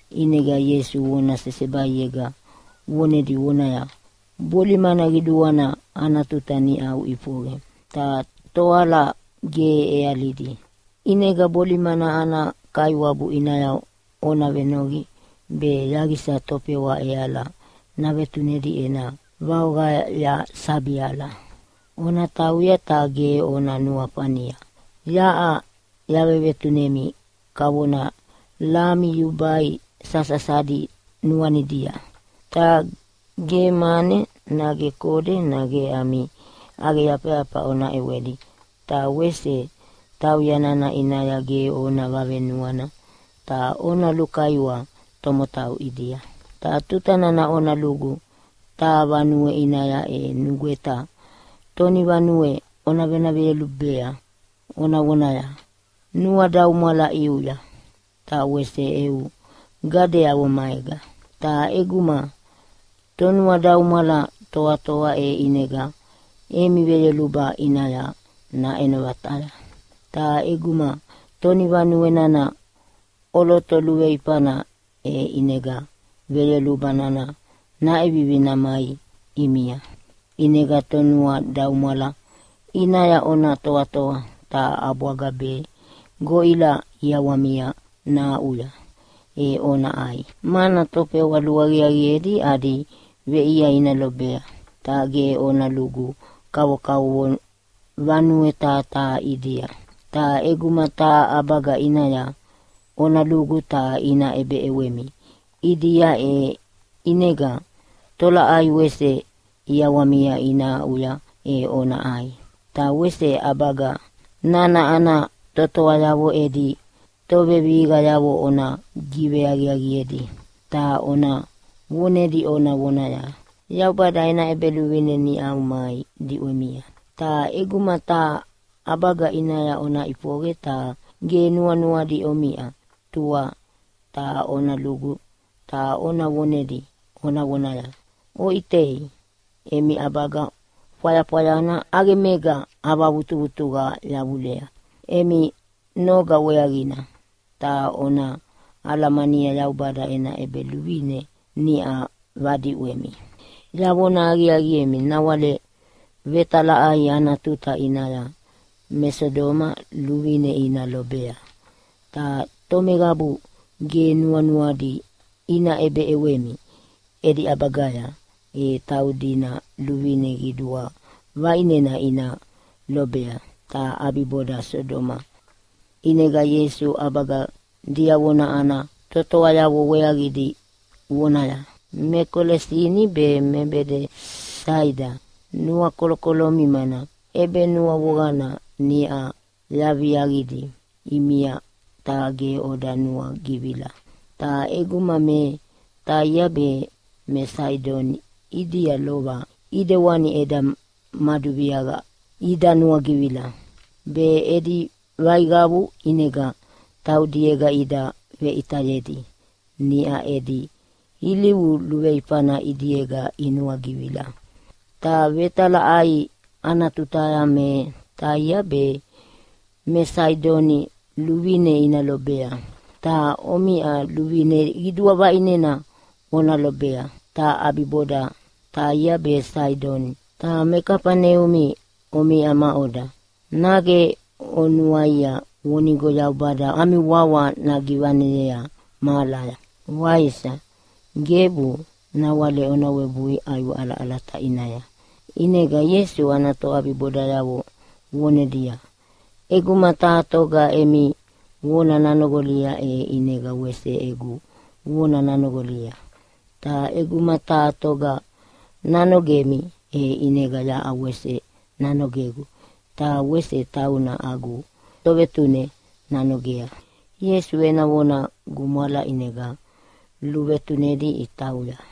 ʼInega Ieisu vona sesebaiega vonedi vonaya, “Bolimana qiduana ana tuta niʼa ʼifoqe ta toala ge ʼealidi, ʼinega bolimana ana Kaiwabu ʼinaya ona venoqi be yaqisa tofewa ʼeala navetunedi ena vaoqaya sabi ala. “Ona tauya, ta ge ona nuafania yaʼa yavevetunemi kavona lami yubai sasasadi nuanidia. Ta ge mane nage kode nage ami ʼaqeyafayafa ona ʼewedi. Ta wese tauya nana ʼinaya ge ona vavenuana ta ona lukaiwa tomotau ʼidia. “Ta tuta nana ona lugu taha vanue ʼinaya, e nugweta tonivanue ona vona veyolubea ona vonaya, ‘Nuadaumwala ʼiuya ta wese eu gadeavo maega!’ Ta ʼeguma tonuadaumwala toatoa e ʼinega emi veyoluba ʼinaya naʼeno vataya. Ta ʼeguma tonivanue nana ʼoloto luveifana e ʼinega veyoluba nana naʼevivi namai ʼimia. ʼInega tonuadaumwala ʼinaya ona toatoa ta ʼabwaga be goʼila ʼiawamia nahaʼuya e ona ʼai, mana tofewa luaqiaqiedi adi veʼia ina lobea. Ta ge ona lugu kavokavovo vanue taha taha ʼidia. “Ta ʼeguma taha ʼabaga ʼinaya ona lugu ta ina ʼebeʼewemi ʼidia, e ʼinega tolaʼai wese ʼiawamia ina aʼuya e ona ʼai. Ta wese ʼabaga nana ana totoayavo edi tovevihiqayavo ona giveaqiaqiedi, ta ona vonedi ona vonaya, ‘Yaubada ena ʼEbeluvine niʼa mai diʼwemia.’ Ta ʼeguma taha ʼabaga ʼinaya ona ʼifoqe ta ge nuanuadi omiʼa, tua ta ona lugu ta ona vonedi ona vonaya, ‘Oʼitei, emi ʼabaga fwayafwayana ʼaqemega avavutuvutuqa yavulea emi noga weaqina. Ta ona alamani, Yaubada ena ʼEbeluvine niʼa vadiʼwemi!’ Yavona aqiaqiemi, nawale vetalaʼai ana tuta ʼinaya me Sodoma luvine ina lobea, ta tomeqabu ge nuanuadi ina ʼebeʼewemi edi ʼabagaya e taudina luvine qidua vaʼinena ina lobea, ta ʼabiboda Sodoma.” ʼInega Ieisu ʼabaga diavona ana totoayavo weaqidi vonaya, “Me Kolesini be me Bedesaida nuakolokolomi, mana ʼebenuavoqana niʼa yaviaqidi ʼimia ta ge oda nuagivila. Ta ʼeguma me Taia be me Saidoni ʼidia lova ʼidewani eda maduviaqia ida nuagivila, be edi vaiqavu ʼinega taudiega ida veʼitayedi niʼa edi ilivu luveifana ʼidiega inuagivila. Ta vetalaʼai ana tutaya me Taia be me Saidoni luvine ina lobea, ta omiʼa luvine qidua vaʼinena ona lobea, ta ʼabiboda Taia be Saidoni. Ta me Kafaneumi omiʼa maʼoda? Nage onuaia vonigo Yaubada ami wawa nagivaneyea mahalaya, waisa? Gebu! Nawale ona webui ʼaiwe ʼalaʼalata ʼinaya.” ʼInega Ieisu ana toʼabibodayavo vonedia, “ʼEguma taha toga emi vona nanoqolia e ʼinega wese egu vona nanoqolia. Ta ʼeguma taha toga nanogemi, e ʼinega yaʼa wese nanogegu ta wese tauna agu Tovetune nanogea.” Ieisu ena vona gumwala ʼinega luvetunedi itauya.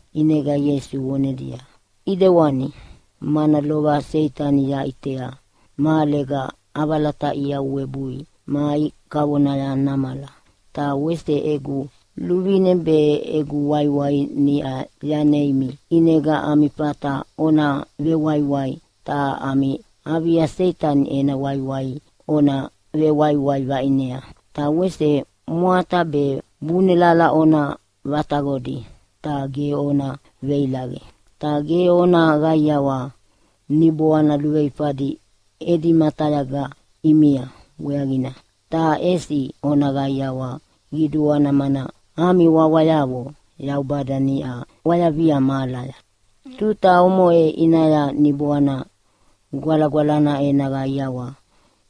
ʼInega Ieisu vonedia, “ʼIdewani, mana lova Seitani yaʼitea mahalega ʼavalataʼia webui mai kavona namala. Ta wese egu luvine be egu waiwai niʼa yaneimi, ʼinega ami fata ona vewaiwai ta ami avia Seitani ena waiwai ona vewaiwai vaʼinea, ta wese mwata be bunelala ona vataqodi ta ge ona veilaqe. Ta ge ona qaiawa niboana luveifadi edi matayaga ʼimia weaqina, ta ʼesi ona qaiawa qiduana mana ami wawayavo Yaubada niʼa ʼwayavia mahalaya.” Tuta omoʼe ʼinaya Niboana Gwalagwalana ena qaiawa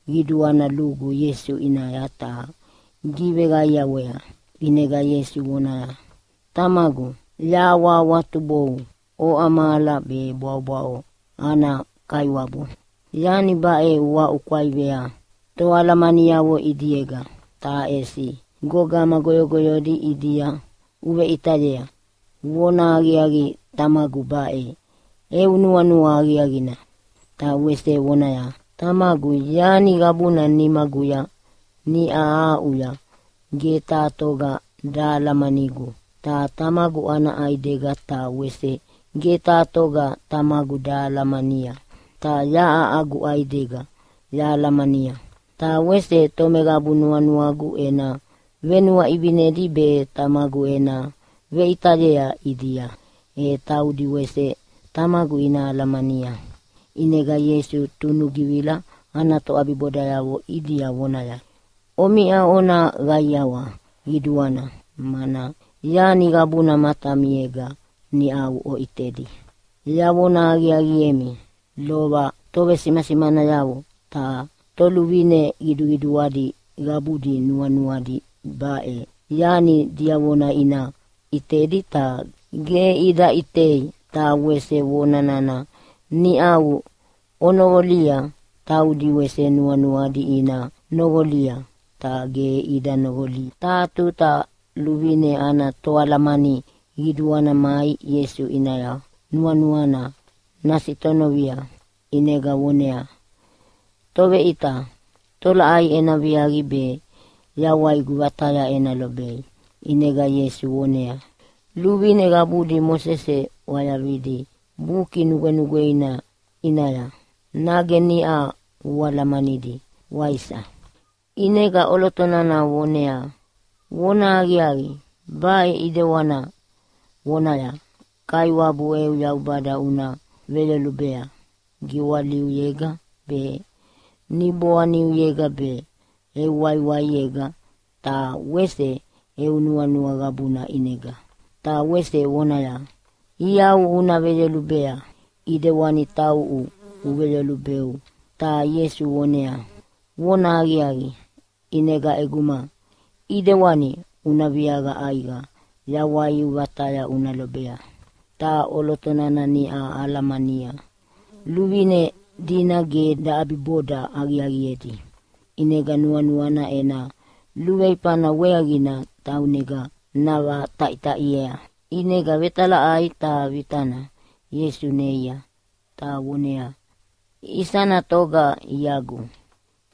qiduana lugu Ieisu ʼinaya ta giveqaiawea, ʼinega Ieisu vonaya, “Tamagu, yahawahawatubou, oʼa mahala be bwaʼobwaʼo ana Kaiwabu! Yani baʼe uaʼukwaivea toalamaniavo ʼidiega, ta ʼesi gogama goyogoyodi ʼidia uveʼitayea. Vonahaqiaqi Tamagu, baʼe eu nuanua aqiaqina.” Ta wese vonaya, “Tamagu yani qabuna nimaguya niʼa aʼuya. Ge taha toga dahalamanigu, ta Tamagu ana ʼaidega. Ta wese ge taha toga Tamagu dahalamania, ta yaʼa agu ʼaidega yahalamania. Ta wese tomeqabu nuanuagu ena venuaʼivinedi be Tamagu ena veʼitayea ʼidia, e taudi wese Tamagu ina alamania.” ʼInega Ieisu tunugivila ana toʼabibodayavo ʼidia vonaya, “Omiʼa ona qaiawa qiduana, mana yani qabuna matamiega niʼau oʼitedi. Yavona aqiaqiemi, lova tovesimasimanayavo ta toluvine qiduqiduadi qabudi nuanuadi baʼe yani diavona ina ʼitedi ta ge ida ʼitei. Ta wese vona nana niʼau onoqolia taudi wese nuanuadi ina noqolia, ta ge ida noqoli.” Taha tuta luvine ana toalamani qiduana mai Ieisu ʼinaya nuanuana nasitonovia ʼinega voneaya, “Toveʼita, tolaʼai ena viaqi be yawaigu vataya ena lobei?” ʼInega Ieisu voneaya, “Luvine qabudi Mosese ʼwayavidi Buki Nugwenugweina ʼinaya nage niʼa ualamanidi, waisa?” ʼInega ʼoloto nana voneaya, “Vonahaqiaqi, baʼe ʼidewana vonaya, ‘Kaiwabu eu Yaubada una veyolubea giwaliuyega be, niboaniuyega be, eu waiwaiega ta wese eu nuanua qabuna ʼinega.’ Ta wese vonaya, ‘Iau una veyolubea ʼidewani tauʼu uveveyolubeu.’” Ta Ieisu voneaya, “Vonahaqiaqi, ʼinega ʼeguma ʼidewani una viaqa ʼaiqa yawaiu vataya una lobea!” Ta ʼoloto nana niʼa alamania luvine dina ge daʼabiboda aqiaqiedi, ʼinega nuanuana ena luveifana weaqina taunega navataʼitaʼiea, ʼinega vetalaʼai taha vitana Ieisu neia, ta voneaya, “Isana toga iagu?”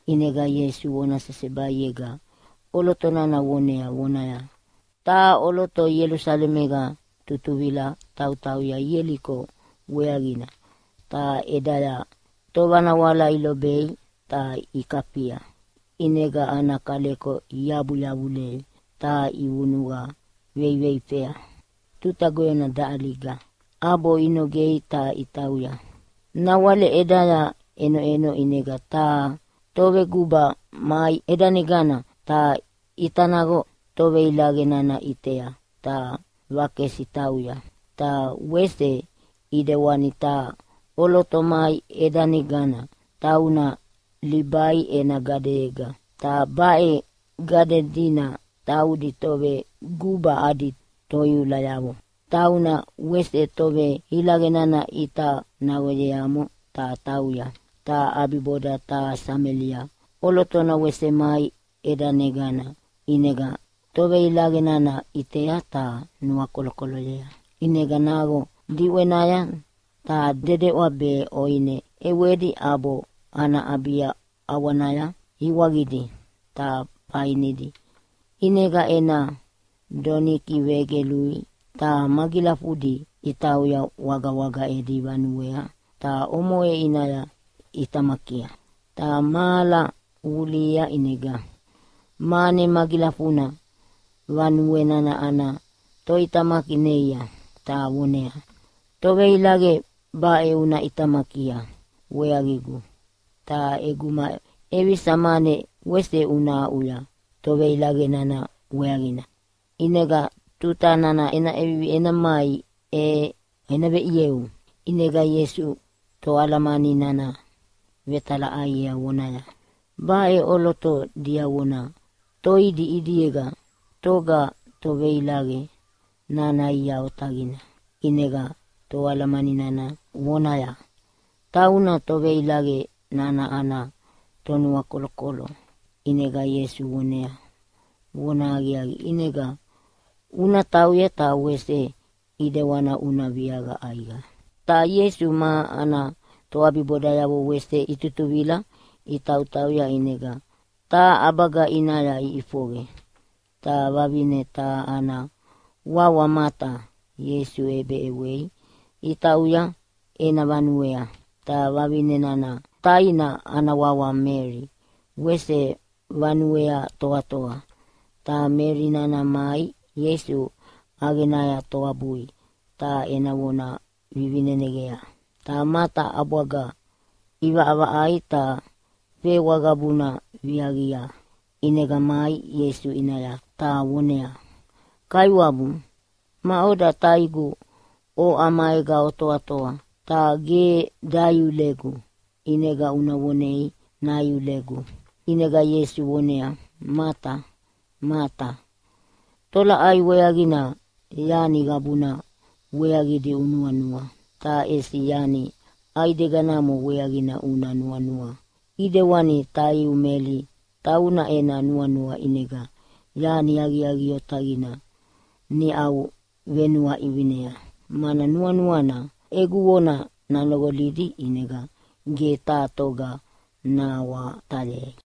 ʼInega Ieisu vona sesebaiega ʼoloto nana vonea vonaya, “Taha ʼoloto Ielusalemega tutuvila tautauya Ieliko weaqina. Ta ʼedaya tovanawala ilobei ta ikafia, ʼinega ana kaleko iabu yavulei ta ivunuqa veiveifea tuta goyona daʼaliga, ʼabo inogei ta itauya. Nawale ʼedaya ʼenoʼeno ʼinega taha toveguba mai ʼedanegana, ta ʼita naqo toveilaqe nana ʼitea ta vakesi tauya. Ta wese ʼidewani taha ʼoloto mai ʼedanegana, tauna Libai ena gadeyega, ta baʼe gade dina taudi toveguba adi toiulayavo. Ta tauna wese toveilaqe nana ʼita naqoyeamo ta tauya. “Ta ʼabiboda taha Samelia ʼolotona wese mai ʼedanegana ʼinega toveilaqe nana ʼitea ta nuakolokoloyea. ʼInega naqo diʼwenaya ta dedeʼwa be ʼoine ʼewedi ʼabo ana ʼabia ʼawanaya iwaqidi ta fainidi. ʼInega ena donikia vegelui, ta magilafudi itauya wagawaga edi vanuea ta omoʼe ʼinaya ʼitamakia. “Ta mahala vulihia ʼinega mane magilafuna vanue nana ana toʼitamaki neia ta voneaya, ‘Toveilaqe baʼe una ʼitamakia weaqigu, ta ʼeguma ʼevisa mane wese una aʼuya toveilaqe nana weaqina, ʼinega tuta nana ena ʼevivi ena mai e ena veʼieu.’” ʼInega Ieisu toalamani nana vetalaʼaiea vonaya, “Baʼe ʼoloto diavona toidi ʼidiega, toga toveilaqe nana ia otaqina?” ʼInega toalamani nana vonaya, “Tauna toveilaqe nana ana tonuakolokolo.” ʼInega Ieisu voneaya, “Vona aqiaqi, ʼinega una tauya ta wese ʼidewana una viaqa ʼaiqa.” Ta Ieisu ma ana toʼabibodayavo wese itutuvila itautauya, ʼinega taha ʼabaga ʼinaya iʼifoqe. Ta vavine taha ana wawa Mata Ieisu ʼebeʼewei itauya ena vanuea. Ta vavine nana taina ana wawa Meli wese vanuea toatoa. Ta Meli nana mai Ieisu ʼaqenaya toabui ta ena vona vivineneqea. Ta Mata ʼabwaga ʼivaʼavaʼaia ta fewa qabuna viaviaqia, ʼinega mai Ieisu ʼinaya ta voneaya, “Kaiwabu, maʼoda taigu oʼa maega otoatoa, ta ge daiulegu. ʼInega una vonei naiulegu!” ʼInega Ieisu voneaya, “Mata, Mata, tolaʼai weaqina yani qabuna weaqidi unuanua? Ta ʼesi yani ʼaideganamo weaqina una nuanua, ʼidewani taiu Meli. Tauna ena nuanua ʼinega yani aqiaqi otaqina niʼa venuaʼivinea mana nuanuana egu vona nanoqolidi, ʼinega ge taha toga nahawatayei.”